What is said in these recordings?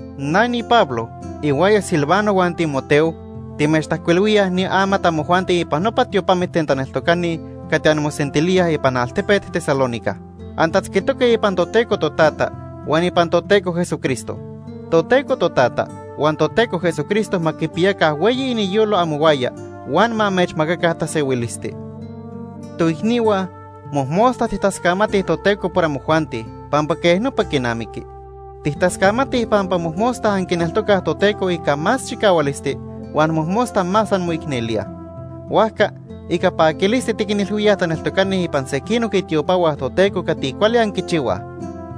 Na niPablo, ihuaya Silvano huan Timoteo, timechtajcuilhuilíaj ni amat amojuanti ipan nopa tiopamit ten taneltocani cati anmosentilíaj ipan altepet Tesalónica. Antatzquitoque ipan Toteco Totata huan ipan Toteco Jesucristo. Toteco Totata huan Toteco Jesucristo ma quipiyaca hueyi iniyolo amohuaya huan ma amechmacaca tasehuilisti. Toicnihua, mojmosta tijtascamatij Toteco por amojuanti, pampa quej nopa quinamiqui. Tijtascamatij pampa mojmosta anquineltocaj Toteco ica más chicahualisti huan mojmosta más anmoicnelíaj. Huajca, ica paquilisti tiquinilhuíaj taneltocani ipan sequinoc itiopahua Toteco cati cuali anquichihuaj.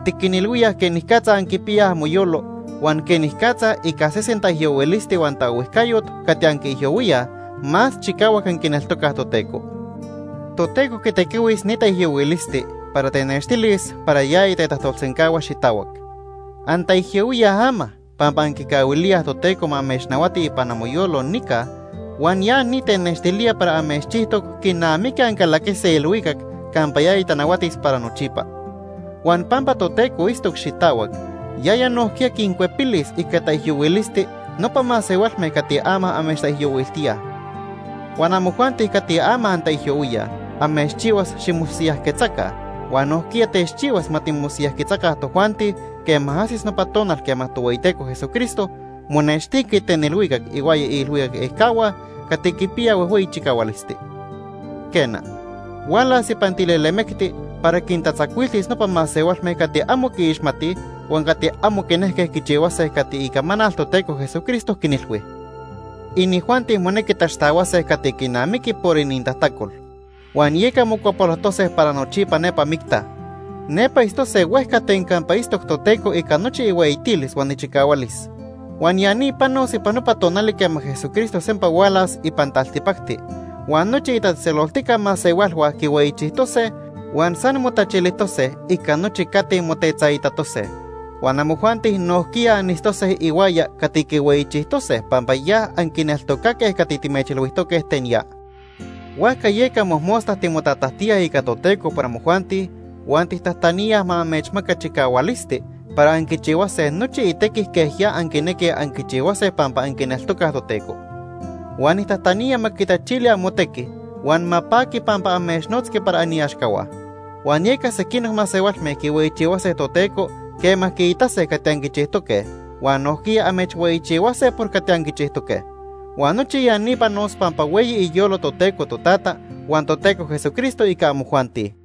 Tiquinilhuíaj quenicatza anquipiyaj amoyolo huan quenicatza ica sesen taijyohuilisti huan taohuijcayot cati anquiijyohuíaj, más chicahuac anquineltocaj Toteco. Toteco quitequihuis ni taijyohuilisti para tenextilis para yaya tetajtolsencahua xitahuac. Antaijyohuíaj ama pampa anquicahuilíaj Toteco ma amechnahuati ipan amoyolo nica huan ya ni tenextilía para amechchijtoc quinamiqui ancalaquise ilhuicac campa yaya tanahuatis para nochipa. Huan pampa Toteco itztoc xitahuac, yaya nojquiya quincuepilis ica taijyohuilisti nopa masehualme cati ama amechtaijyohuiltíaj. Huan amojuanti cati ama antaijyohuíaj, amechchihuas ximosiyajquetzaca huan nojquiya techchihuas ma timosiyajquetzaca tojuanti quema ajsis nopa tonal quema Tohueyiteco Jesucristo monextiqui ten ilhuicac ihuaya iilhuicac ejcahua cati quipiyaj huejhueyi chicahualisti. Quena, hualas ipan tilelemecti para quintatzacuiltis nopa masehualme cati amo quiixmatij huan cati amo quinejque quichihuase cati icamanal Toteco Jesucristo quinilhui. Inijuanti monequi taxtahuase cati quinamiqui por inintajtacol, huan yeca mocuapolojtose para nochipa nepa micta. Nepa itztose huejca ten campa itztoc Toteco ica nochi ihueyitilis huan ichicahualis. Huan ya ni panos ipan nopa tonali quema Jesucristo sempa hualas ipan taltipacti huan nochi itatzejtzeloltica masehualhua quihueyichijtose huan san motachilijtose ica nochi cati motetzaitatose. Huan amojuanti nojquiya anitztose ihuaya cati quihueyichijtose pampa ya anquineltocaque cati timechilhuijtoque ten ya. Huajca yeca mojmosta timotatajtíaj ica Toteco por amojuanti huan tijtajtaníaj ma amechmaca chicahualisti para anquichihuase nochi itequi quej ya anquinequij anquichihuase pampa anquineltocaj Toteco. Huan nijtajtanía ma quitachili amotequi huan ma paqui pampa amechnotzqui para aniaxcahua. Huan yeca sequinoc masehualme quihueyichihuase Toteco quema quiitase cati anquichijtoque, huan nojquiya amechhueyichihuase por cati anquichijtoque. Huan nochi ya ni panos pampa hueyi iniyolo Toteco Totata huan Toteco Jesucristo ica amojuanti.